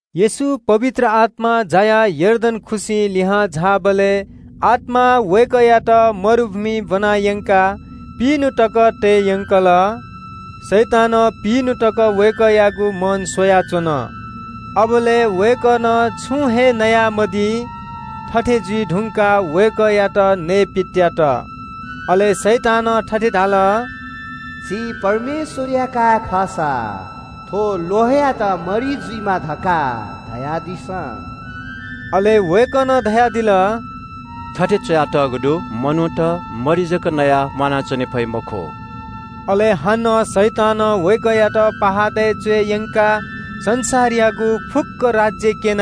येशू पवित्र आत्‍मां जायाः यर्दन खुसिं लिहां झाःबलय् आत्‍मां वय्‌कःयात मरुभूमिइ ब्‍वना यंकाः पिइन्‍हु तक तये यंकल। शैतानं पिइन्‍हु तक वय्‌कःयागु मन स्‍वयाच्‍वन। अबलय् वय्‌कलं छुं हे नयामदी। थथे जुइ धुंकाः वय्‌कःयात नयेपित्‍यात। अले शैतानं थथे धाल – “छि परमेश्‍वरया काय् खःसा थ्‍व ल्‍वहंयात मरि जुइमा धकाः धयादिसँ।” अले वय्‌कलं धयादिल – “थथे च्‍वयातःगु दु – ‘मनूत मरि जक नयाः म्‍वानाच्‍वने फइ मखु।’” अले हानं शैतानं वय्‌कःयात पहाडय् च्‍वय् यंकाः संसारयागु फुक्‍क राज्‍य क्‍यन,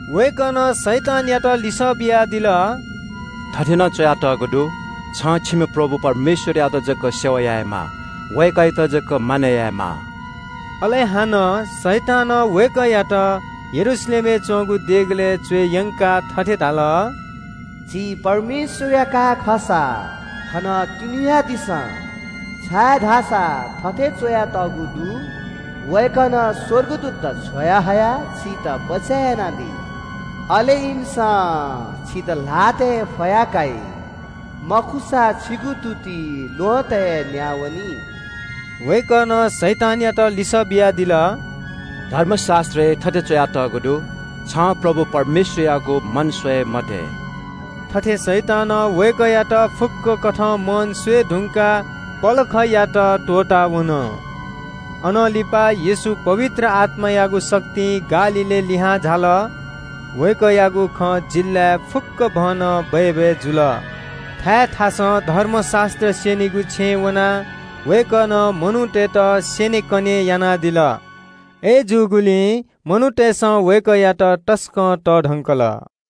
वय्‌कलं शैतानयात लिसः बियादिल – “थथे नं च्‍वयातःगु दु – “‘छं छिम्‍ह प्रभु परमेश्‍वरयात जक सेवा यायेमाः। वय्‌कःयात जक मानय् यायेमाः।’” अले हानं शैतानं वय्‌कःयात यरूशलेमय् च्‍वंगु देगलय् च्‍वय् यंकाः थथे धाल – “छि परमेश्‍वरया काय् खःसा थनं तिंन्‍हुयादिसँ, छाय्‌धाःसा थथे च्‍वयातःगु दु – “‘वय्‌कलं स्‍वर्गदूतत छ्वयाहयाः छितः बचय् यानादी।’ अले ‘इमिसं छितः ल्‍हातय् फया काइ। मखुसा छिगु तुति ल्‍वहँतय् न्‍याः वनी।’” वय्‌कलं शैतानयात लिसः बियादिल – “धर्मशास्‍त्रय् थथे च्‍वयातःगु दु – ‘छं परमप्रभु परमेश्‍वरयागु मन स्‍वये मते।’” थथे शैतानं वय्‌कःयात फुक्‍क कथं मन स्‍वये धुंकाः पलखयात त्‍वःतावन। अनं लिपा येशू पवित्र आत्‍मायागु शक्तिं गालीलय् लिहां झाल। वय्‌कःयागु खँ जिल्‍लाय् फुक्‍कभनं बय्‌बय् जुल। थाय् थासय् धर्मशास्‍त्र स्‍यनीगु छेँय् वनाः वय्‌कलं मनूतय्‌त स्‍यनेकने यानादिल। अय्‌जूगुलिं मनूतय्‌सं वय्‌कःयात तसकं तःधकंल।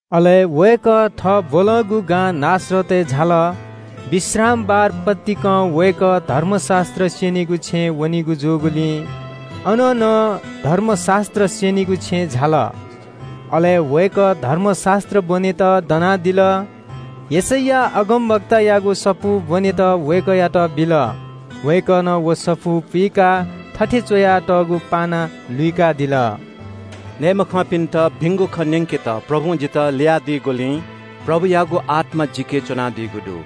अले वय्‌कः थः ब्‍वलंगु गां नासरतय् झाल। विश्रामबार पतिकं वय्‌कः धर्मशास्‍त्र स्‍यनीगु छेँय् वनीगु जूगुलिं अन नं धर्मशास्‍त्र स्‍यनीगु छेँय् झाल। अले वय्‌कः धर्मशास्‍त्र ब्‍वनेत दनादिल। यशैया अगमवक्तायागु सफू ब्‍वनेत वय्‌कःयात बिल। वय्‌कलं व सफू पुइकाः थथे च्‍वयातःगु पाना लुइकादिल – “मगाःमचाःपिन्‍त भिंगु खँ न्‍यंकेत परमप्रभुं जितः ल्‍ययादीगुलिं परमप्रभुयागु आत्‍मा जिके च्‍वनादीगु दु।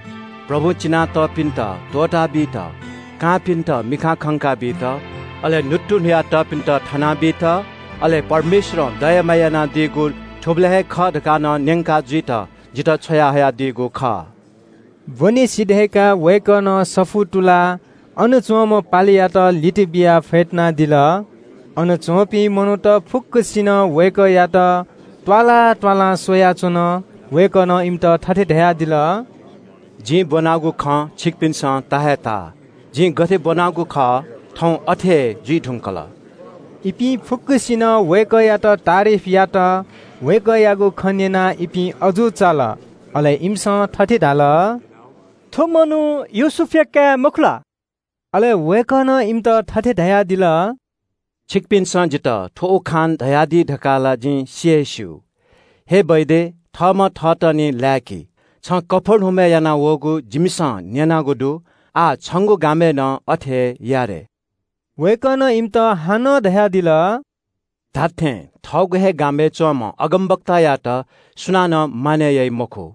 परमप्रभुं चिना तःपिन्‍त त्‍वःताबीत, कांपिन्‍त मिखां खंका बीत, अले न्‍हुत्तुन्‍हुया तःपिन्‍त थना बीत, अले परमप्रभुं दया माया यानादीगु थुबलय् हे खः धकाः नं न्‍यंका जुइत जितः छ्वयाहयादीगु खः।” ब्‍वने सिधय्‌काः वय्‌कलं सफू तुलाः अन च्‍वंम्‍ह पालेयात लित बियाः फ्‍यतुनादिल। अन च्‍वंपिं मनूत फुक्‍कसिनं वय्‌कःयात त्‍वालां त्‍वालां स्‍वयाच्‍वन। वय्‌कलं इमित थथे धयादिल – “जिं ब्‍वनागु खँ छिकपिन्‍सं ता हे ताः। जिं गथे ब्‍वनागु खः, थौं अथे हे जुइ धुंकल।” इपिं फुक्‍कसिनं वय्‌कःयात तारिफ यात। वय्‌कःयागु खँ न्‍यनाः इपिं अजू चाल। अले इमिसं थथे धाल – “थ्‍व मनू योसेफया काय् मखु ला?” अले वय्‌कलं इमित थथे धयादिल – “छिकपिन्‍सं जितः थ्‍व उखान धयादी धकाः ला जिं सि हे स्‍यू – ‘हे डाक्‍टर, थःम्‍हं थःतः निं लाय्‌कि। छं कफर्नहुमय् यानावःगु जिमिसं न्‍यनागु दु, आः छंगु गामय् नं अथे हे या रे।’ वय्‌कलं इमित हानं धयादिल – धात्‍थें, थःगु हे गामय् च्‍वंम्‍ह अगमवक्तायात सुनानं मानय् याइ मखु।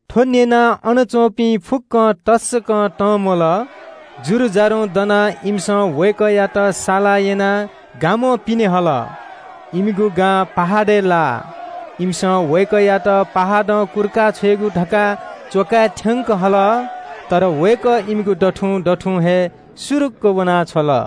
थ्‍व न्‍यनाः अन च्‍वंपिं फुक्‍कं तसकं तंम्‍वल। जुरुजारुं दनाः इमिसं वय्‌कःयात साला यनाः गामं पिने हल। इमिगु गां पहाडय् लाः। इमिसं वय्‌कःयात पहाडं कुर्का छ्वयेगु धकाः च्‍वकाय् थ्‍यंक हल। अय्‌नं वय्‌कः इमिगु दथुं दथुं हे सुरुक्‍क वना छ्वल।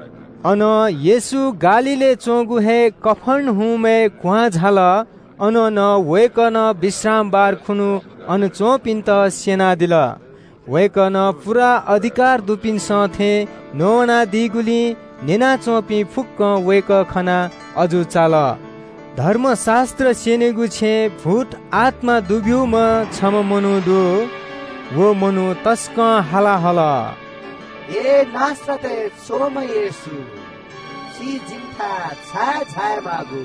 अनं येशू गालीलय् च्‍वंगु हे कफर्नहुमय् क्‍वहां झाल। अन नं वय्‌कलं विश्रामबार खुन्‍हु अन च्‍वंपिन्‍त स्‍यनादिल। वय्‌कलं पूरा अधिकारं न्‍ववानादीगुलिं न्‍यना च्‍वंपिं फुक्‍कं वय्‌कः खनाः अजू चाल। धर्मशास्‍त्र स्‍यनीगु छेँय् भूतआत्‍मा दुब्‍यूम्‍ह छम्‍ह मनू दु। व मनू तसकं हाला हल – “हे नासरतय् च्‍वंम्‍ह येशू, छि जिमिथाय् छाय् झायेमाःगु?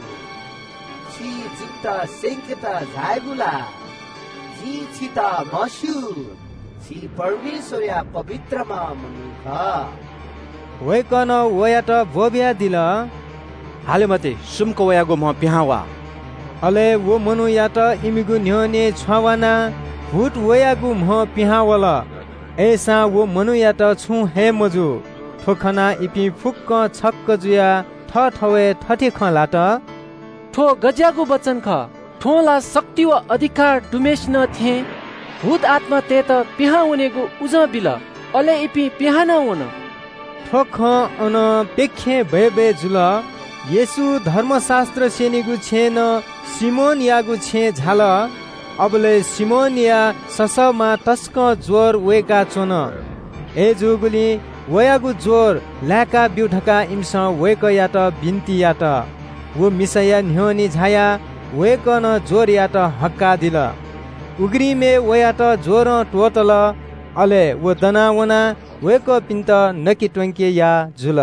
छि जिमित स्‍यंकेत झायागु ला? जिं छितः म्‍हस्‍यू, छि परमेश्‍वरया पवित्रम्‍ह मनू खः।” वय्‌कलं वयात ब्‍वःबियादिल – “हाले मते, सुम्‍क वयागु म्‍हं पिहां वा।” अले व मनूयात इमिगु न्‍ह्यःने छ्वावानाः भूत वयागु म्‍हं पिहां वल, अय्‌सां व मनूयात छुं हे मजू। थ्‍व खनाः इपिं फुक्‍कं छक्‍क जुयाः थःथवय् थथे खँ ल्‍हात – “थ्‍व गज्‍याःगु वचन खः? थ्‍वं ला शक्ति व अधिकार दुम्‍हय्‌सिनं थें भूतआत्‍मातय्‌त पिहां वनेगु उजं बिल, अले इपिं पिहां नं वन।” थ्‍व खँ अनं प्‍यखें बय्‌बय् जुल। येशू धर्मशास्‍त्र स्‍यनीगु छेँनं सिमोनयागु छेँय् झाल। अबलय् सिमोनया ससःमां तसकं ज्‍वर वय्‌काच्‍वन। अय्‌जूगुलिं वयागु ज्‍वर लाय्‌काब्‍यु धकाः इमिसं वय्‌कःयात बिन्‍ति यात। व मिसाया न्‍ह्यःने झायाः वय्‌कलं ज्‍वरयात हक्‍काः दिल। उघ्रिमय् वयात ज्‍वरं त्‍वःतल। अले व दना वनाः वय्‌कःपिन्‍त नके त्‍वंके याः जुल।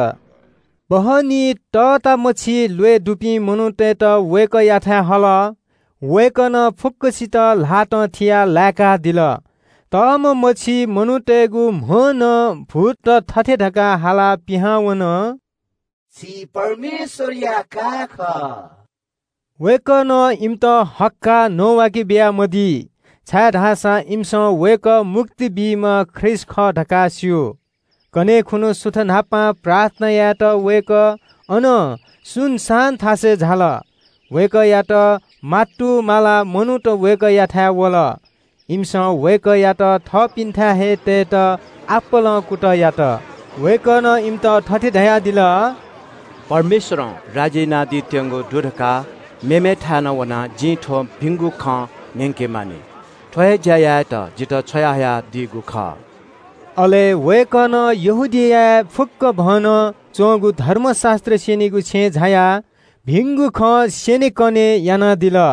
सन्‍ध्‍याकाः इलय् तःतामछि ल्‍वय् दुपिं मनूतय्‌त वय्‌कःयाथाय् हल। वय्‌कलं फुक्‍कसित ल्‍हातं थियाः लाय्‌कादिल। तःम्‍ह मछि मनूतय्‌गु म्‍हं नं भूतत थथे धकाः हालाः पिहां वन – “छि परमेश्‍वरया काय् खः।” वय्‌कलं इमित हक्‍काः न्‍ववाके बियामदी, छाय्‌धाःसा इमिसं वय्‌कः मुक्ति बीम्‍ह ख्रीष्‍ट खः धकाः स्‍यू। कन्‍हय् खुन्‍हु सुथ न्‍हापां प्रार्थना यायेत वय्‌कः अनं सुनसान थासय् झाल। वय्‌कःयात मातुमालाः मनूत वय्‌कःयाथाय् वल। इमिसं वय्‌कःयात थःपिन्‍थाय् हे तयेत आपालं कुतः यात। वय्‌कलं इमित थथे धयादिल – “परमेश्‍वरया राज्‍ययागु भिंगु खँ मेमेथाय् नं वनाः जिं न्‍यंके मानि। थ्‍व हे ज्‍या यायेत जितः छ्वयाहयादीगु खः।” थथे वय्‌कलं यहूदियाय् फुक्‍कभनं च्‍वंगु धर्मशास्‍त्र स्‍यनीगु छेँय् झायाः भिंगु खँ स्‍यनेकने यानादिल।